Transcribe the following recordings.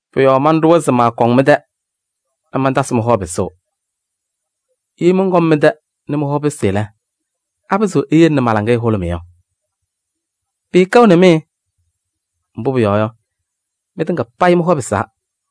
Pʋ-yɔɔ manɖʋwa se maakɔŋ mɩ-tɛ nɛ mantasɩ mɩ-hɔ pɩsʋʋ. Ye mɔnkɔm mɩ-tɛ nɛ mɩ-hɔ pɩsɩ lɛ, apɩzɩɣ eyele nɛ ma-laŋɩyɛ hʋlʋmɩ yɔ? Pɩɩkɛɣnɩ mɩ! Mbʋ pʋyɔɔ yɔ, mɩtɩŋa payɩ mɩ-hɔ pɩsaa.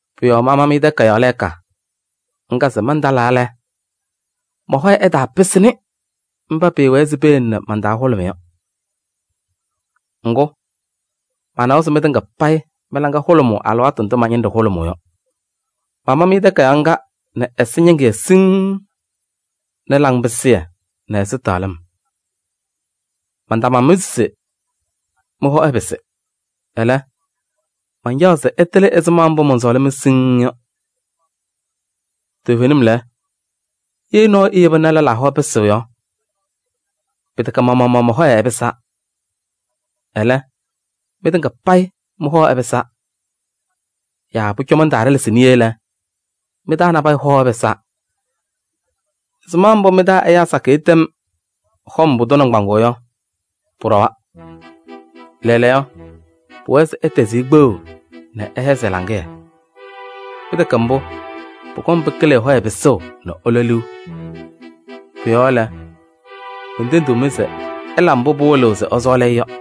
Pʋ-yɔɔ mama-mɩ takayaɣ lɛɛka ŋga se mantalaa lɛ, mɔ-hɔyɛ ɛtaapɩsɩnɩ mba pɩɩwɛɛ se peyele ma-laŋɩyɛ hʋlʋmɩ yɔ. Ŋgʋ, manawa se mɩtɩŋa payɩ mɩ-laŋa hʋlʋmʋʋ alɩwaatʋ ndʋ ma-ñɩnɖɛ hʋlʋmʋʋ yɔ. Mama-mɩ takayaɣ ŋga nɛ ɛsɛñɩŋɩyɛ siŋŋ nɛ laŋpɩsɩyɛ nɛ ɛzɩtɛɣlɩm. Mantama-mɩ se mɩ-hɔ ɛpɩsɩ. Ɛlɛ, mancaɣaɣ se ɩtɩlɩ ɛzɩma mbʋ mɔnsɔɔlɩ-mɩ siŋŋ yɔ. Toovenim lɛ, ye nɔɔyʋ eyeba nɛ ɛyaa hɔ pɩsɩ yɔ, pɩtɛkɛ ma-maɣmaɣ mɔ-hɔyɛ ɛpɩsaa. Ɛlɛ, mɩtɩŋa payɩ mɩ-hɔ ɛpɩsaa. Yaa pʋcɔ mantaaɖɛlɛsɩ niye lɛ, mɩ-taa nabɛyɛ hɔ ɛpɩsaa. Ɛzɩma mbʋ mɩ-taa ɛyaa sakɩyɛ tɛm hɔm pʋdʋ nɩŋgbaŋʋʋ yɔ, pʋɖɔwa. Lɛɛlɛɛyɔ, pʋwɛɛ se ɩtɛzɩ-ɩ kpeɣu nɛ ɩhɛzɩ ɛ-laŋɩyɛ. Pɩtɛkɛ mbʋ, pʋkɔŋ pɩkɩlɩ ɛ-hɔyɛ pɩsʋʋ nɛ ɛlɔ liu. Pʋ-yɔɔ lɛ, mentendiɣ-mɩ se ɩla mbʋ pɩwɩlɩɣ se ɩsɔɔlɩ-ɩ yɔ.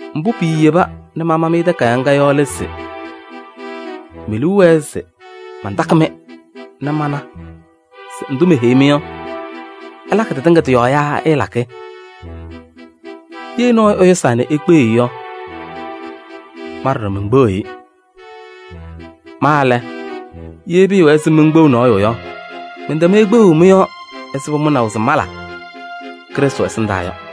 Mbʋ piiyeba nɛ mama-mɩ takayaɣ ŋga yɔ lɛ se: me-liu wɛɛ se mantakɩ-mɩ nɛ mana se ndʋ meheyiɣ-mɩ yɔ, ɩlakɩ tɩtɩŋa tɩ-yɔɔ yaa ɩɩlakɩ. Ye nɔɔyʋ ɛyʋsaa nɛ ikpeɣ-i yɔ, ma ɖɔɖɔ menkpeɣiɣ-i. Ma lɛ, ye pɩɩwɛɛ se menkpeɣ nɔɔyʋ yɔ, mɛntɛm-ɩ kpeɣu mɩ-yɔɔ ɛzɩ pʋmʋnaʋ se mala Krɩstʋ ɛsɩndaa yɔ.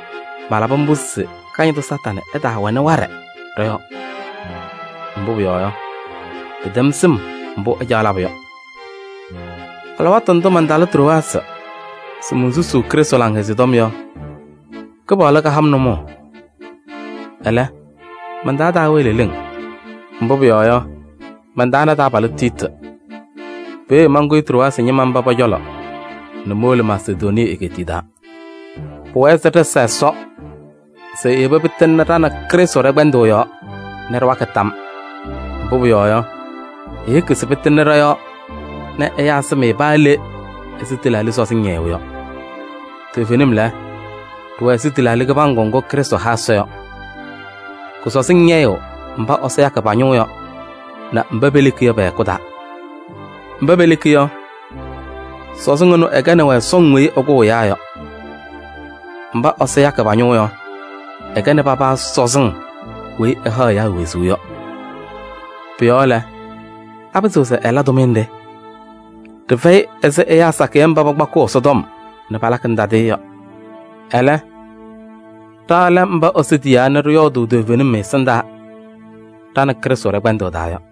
Malabɩ mbʋ se Kañadʋ Satanɩ ɛtaawɛnɩ waɖɛ ɖɔ-yɔɔ. Mbʋ pʋyɔɔ yɔ, ɖɩtɛm sɩm mbʋ ɛcaɣ labʋ yɔ. Alɩwaatʋ ndʋ mantalɩ Trowaasɩ se monsusuu Krɩstʋ Laŋhɛzɩyɛ Tɔm yɔ, Kɩpaɣlʋ kaha-m nʋmɔʋ. Ɛlɛ, man-taa taawɛɛ leleŋ, mbʋ pʋyɔɔ yɔ, mantaana taabalʋ Tiiti. Peeye mankʋyɩ Trowaasɩ ñɩma mba pɔ-cɔlɔ nɛ mowolo Masedonii egeetiye taa. Pʋwɛɛ se ɖɩsa Ɛsɔ se eyeba pɩtɩŋna ɖa nɛ Krɩstʋ ɖɛ-kpɛndʋʋ yɔɔ nɛ ɖɩwakɩ tam. Mbʋ pʋyɔɔ yɔ, eyeki se pɩtɩŋnɩ ɖɔ-yɔɔ nɛ ɛyaa sɩm-ɩ paa le ɛzɩ tɩlaaɖɩ sɔzɩŋ ñɛyʋʋ yɔ. Toovenim lɛ, ɖɩwɛ ɛzɩ tɩlaaɖɩ kɩbaŋgʋ ŋgʋ Krɩstʋ ha Ɛsɔ yɔ. Kʋ-sɔzɩŋ ñɛyɩɣ mba Ɛsɔ yakɩ pa-ñʋʋ yɔ nɛ mba peleki yɔ pɛ-hɛkʋ taa. Mba peleki yɔ, sɔzɩŋ ɛnʋ ɛkɛnɩ-wɛ sɔŋ weyi ɛkʋʋ ɛyaa yɔ. Mba Ɛsɔ yakɩ pa-ñʋʋ yɔ, ɛkɛnɩ paba sɔzɩŋ weyi ɛhaɣ ɛyaa wezuu yɔ. Pʋ-yɔɔ lɛ, apɩzɩɣ se ɛla tʋmɩyɛ nɖɩ? Ɖɩfɛyɩ ɛzɩ ɛyaa sakɩyɛ mba pakpakɩɣ Ɛsɔtɔm nɛ palakɩnɩ tadɩyɛ yɔ. Ɛlɛ, ɖa lɛ mba Ɛsɔ tiyaa nɛ ɖɩyɔɔdʋʋ toovenim ɛ-ɛsɩndaa ɖa nɛ Krɩstʋ ɖɛ-kpɛndʋʋ taa yɔ.